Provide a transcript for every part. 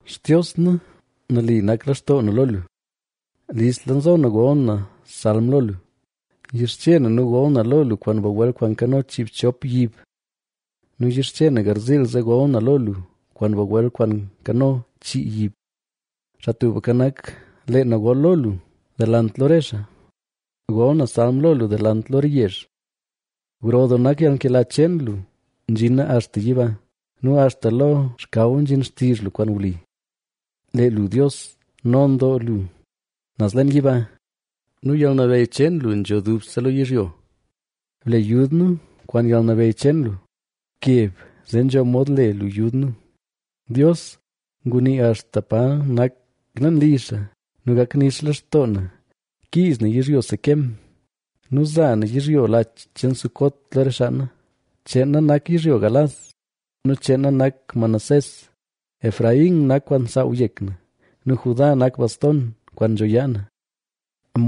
Xtios na, nali nak lextoo na lo lu; listla nzo na gol na salm lo lu. Yixche na nu gol na lo lu kwaan bagwel kwaan nkano chiibchop yib nu yixche na garziil zee gol na lo lu kwaan bagwel kwaan nkano chii yib. Xaa Tubka Nak, lee na gol lo lu delant lo re xaa; gol na salm lo lu delant lo re yezh. Gro doo nak yalnkela cheen lu nzhina axta yiba; ¡nu axta lo xkaw nzhin xtizh lu kwaan wli! ¡Lee lu Dios, non doo lu naz leen yiba nu yalnabeyy cheen lu nzho dubse lo yizhyo! ¡Ble yud nu kwaan yalnabeyy cheen lu! ¡Bkeb zee nzho mod le lu yud nu! Dios ngunii axta pa nak leen li xaa: “Gak nix lextoo na kiiz na yizhyo Siquem nu za na yizhyo lach cheen Sucot lo re xaa na. Cheen na nak yizhyo Galaad nu cheen na nak Manasés; Efraín nak kwaan nsaaw yek na nu Judá nak bastona kwaan nzho yaa na.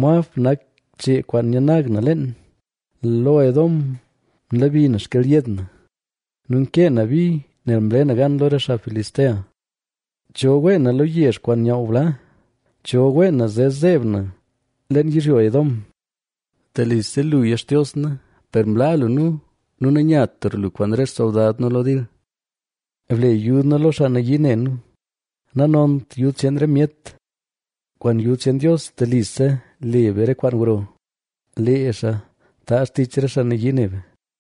Moab nak chee kwaan nyanag na leen, lo Edom nlebi na xkelyed na; nu nkee na bi nel mle na gan lo re xaa Filistea.” ¿Cho wee na lo yezh kwaan nyaaw bla? ¿Cho wee na zee zeeb na leen yizhyo Edom? Telise luya Xtios na, che naleet lu mlaa lu nu, per mlaa lu nu, nu nanyatra lu kwaan re xsoldad nu lo dil. Ble yud nu lo xaa nayii ne nu, nanont yud cheen re myet. ¡Kwaan yud cheen Dios telise le be re kwaan gro; lee xaa taazh tich re xaa nayii ne be!